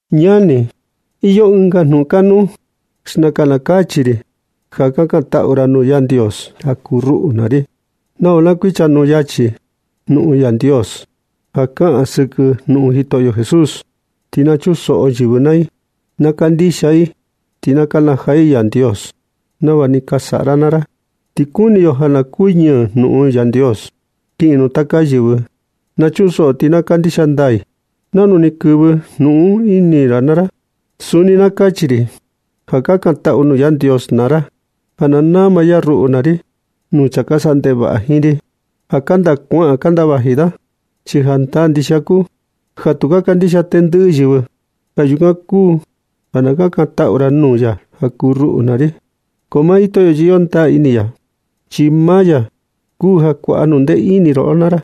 Ñani, iyo ɨnga jnuꞌun kanuu. Xnakan na kachi ri ja kakantaꞌu naa ra nuu Yandios ja kuu ruꞌu naa ri, nava na kuichanuu yachi ga jnuꞌun Yandios ja kaꞌan sɨkɨ Jitoꞌo Jesús. Ti na chunsoꞌo yɨvɨ naa i, na kandixia i, ti na kanajaa i Yandios, nava ni ka saꞌa ra naa ra. Ti kuni yo ja na kuñɨɨ jnuꞌun Yandios kiꞌin nuu taka yɨvɨ, na chunsoꞌo ti na ka kandixia ndaa i, nanu ni kɨvɨ jnuꞌun un ini maa ra naa ra. Suni na kachi ri ja kakantaꞌu nuu Yandios naa ra ja na nama ya ruꞌu naa ri nuu chaa ka saꞌa ndevaꞌa jiin ri, ja kanda kuaꞌan kanda vaji da. Chi jandaa ndixia kuu ja tu ka kandixia tendɨꞌɨ yɨvɨ. Yukan kuu ja na kakantaꞌu ra nuu ya ja kuu ruꞌu naa ri. Ko maa Jitoꞌo chi iyo ndaa ini ya, chi maa ya kuu ja kuaꞌa jnundee ini roꞌo naa ra,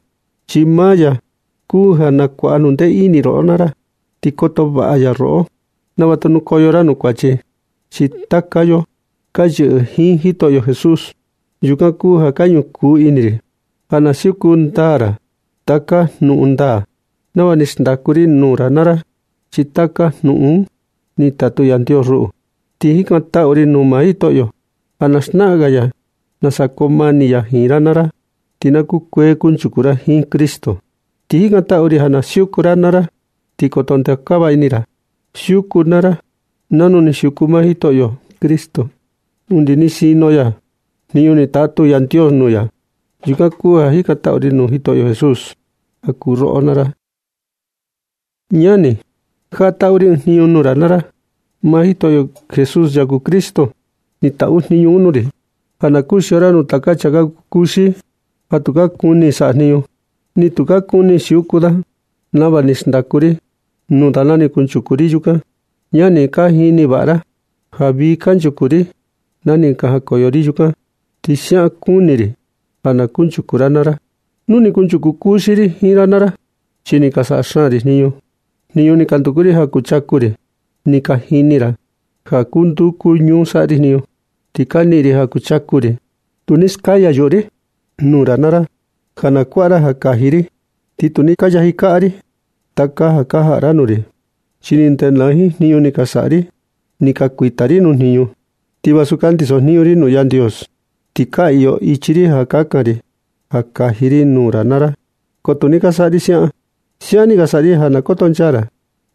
chi maa ya kuu ja kuaꞌa jnundee ini roꞌo naa ra, ti koto vaꞌa ya roꞌo nava tu nukoyo ra nuu kuachi. Chi taka yo, ka yɨꞌɨ jiin Jitoꞌo Jesús. Yukan kuu ja ka ñukuu ini ri, ja na siuku ndaa ra taka jnuꞌun ndaa, nava ni ka xndaku ri nuu ra naa ra. Chi taka jnuꞌun un, ni tatu Yandios ruꞌu. Ka jikantaꞌu ri nuu maa Jitoꞌo, ja na xnaꞌan ga ya nasa koo mani ya jiin ra naa ra, ti na kukuee kunchuku ra jiin Cristo. Ti jikantaꞌu ri ja na siuku ra naa ra, ti koto ndeokava ini ra. Siuku naa ra nanu ni siuku maa Jitoꞌo Cristo undi ni sinu ya jniñu ni tatu Yandios nuu ya. Yukan kuu ja ka jikantaꞌu ri nuu Jitoꞌo Jesús ja kuu roꞌo naa ra. Ñani, jaꞌa na taꞌu ri ɨɨn jniñu nuu ra naa ra. Maa Jitoꞌo Jesús, ya kuu Cristo, ni taꞌu jniñu un nuu ri, ja na kuxio ra nuu taka chaa ka kuu kuxi ja tuu ka kuni saꞌa jniñu, ni tu ka kuni siuku da nava ni ka xndaku ri nuu da na ni kunchuku ri yukan. Ñani, ka jini vaꞌa ra ja vii kanchuku ri na ni ka jakoyo ri yukan, ti siaꞌan kuni ri ja na kunchuku ra naa ra. Tu ni kunchuku kuxi ri jiin ra naa ri, chi ni ka saꞌa xaan ri jniñu ni ka nduku ri ja kuchaku ri. Ti ni ka jini ra ja kuu nduu kuu ñuu ni ka saꞌa ri jniñu ti ni ka niꞌin ri ja kuchaku ri. Tu ni skaya yuꞌu ri nuu ra naa ra ja na kuaꞌa ra ja kaji ri, ti tu ni ka yaji kaꞌa ri taka ja ka jaꞌa ra nuu ri, chi ni ndenaa jiin jniñu ni ka saꞌa ri. Ni ka kuita ri nuu jniñu, ti vasu ka ndisojniñu ri nuu Yandios, ti ka iyo ichi ri ja kakan ri ja kaji ri nuu ra naa ra. Ko tu ni ka saꞌa ri siaꞌan. Siaꞌan ni ka saꞌa ri ja na kotonchaa ra,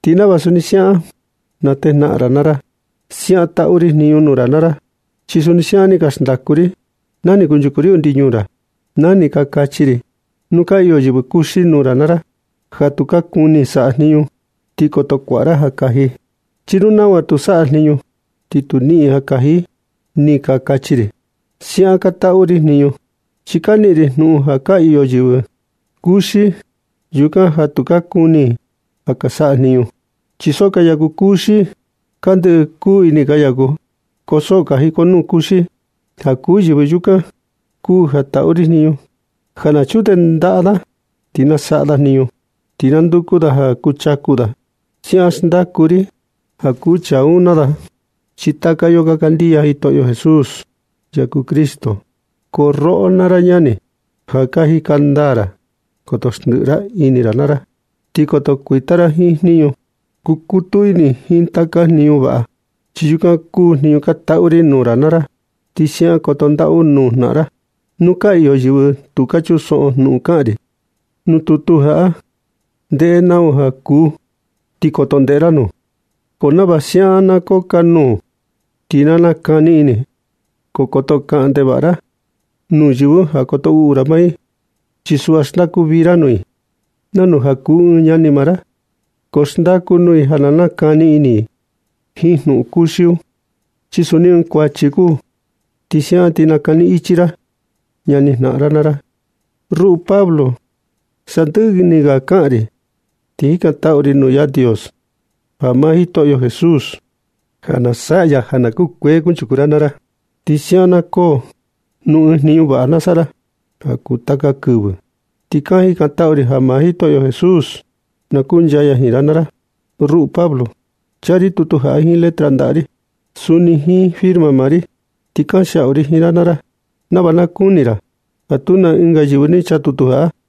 ti nava suni siaꞌan na natejnaꞌan ra naa ra. Siaꞌan taꞌu ri jniñu jaꞌa nuu ra naa ra, chi suni siaꞌan ni ka xndaku ri na ni kunchuku ri undi ñuu ra, na ni ka kachi ri: “Nu ka iyo yɨvɨ kuxi nuu ra naa ra ja tu ka kuni saꞌa jniñu, ti koto kuaꞌa ra ja kaji. Chi nu nau ja tu saꞌa jniñu ti tu niꞌin ja kaji”, ni ka kachi ri. Siaꞌan ka taꞌu ri jniñu, chi ka niꞌin ri jnuꞌun ja ka iyo yɨvɨ kuxi yukan ja tu ka kuni ka saꞌa jniñu, chi so ka yaku kuxi. Ka ndɨꞌɨ kuu ini ka yaku, ko so ka jikonuu kuxi. Ja kuu yɨvɨ yukan kuu ja taꞌu ri jniñu ja na chundee ndaꞌa da ti na saꞌa da jniñu, ti na nduku da ja kuchaku da. Siaꞌan xndaku ri ja kuu chaa un naa da, chi taka yo ka kandixia Jitoꞌo Jesús, ya kuu Cristo. Ko roꞌo naa ra ñani, ja ka jika ndaa ra. Koto xndiꞌi ra ini ra naa ra, ti koto kuita ra jiin jniñu. Kukutu ini jiin taka jniñu vaꞌa, chi yukan kuu jniñu ka taꞌu ri nuu ra naa ra, ti siaꞌan koto ndaꞌu nuu jnaꞌan ra. Nu ka iyo yɨvɨ ja tu ka kuni chunsoꞌo jnuꞌun kaꞌan ri nuu tutu jaꞌa, ndeꞌe nau ja kuu, ti koto ndeꞌe ra nuu. Ko nava siaꞌan na kukanuu ti na nakani ini. Ko koto kaꞌan ndevaꞌa ra nuu yɨvɨ un ja koto uꞌu ra maa i, chi suꞌva xndaku vii ra nuu i nanu ja kuu i ɨɨn ñani maa ra. Ko xndaku nuu i ja na nakani ini i jiin jnuꞌun kuxi un, chi suni ɨɨn kuachi kuu. Ti siaꞌan ti nakani ichi ra ñani jnaꞌan ra naa ra. Ruꞌu Pablo, sandɨꞌɨ ni ga kaꞌan ri ti jikantaꞌu ri nuu Yandios ja maa Jitoꞌo Jesús, na saꞌa ya ja na kukuee kunchuku ra naa ra. Ti siaꞌan na koo nɨ ɨɨn jniñu vaꞌa saꞌa ra ja kuu taka kivɨ. Ti ka jikantaꞌu ri ja maa Jitoꞌo Jesús na kuncha ya jiin ra naa ra. Ruꞌu Pablo, chaa ri tutu jaꞌa jiin letra ndaꞌa ri, suni jiin firma maa ri, ti kanxiaꞌu ri jiin ra naa ra nava na kuni ra ja tu na ɨnga yɨvɨ ni chaa tutu jaꞌa.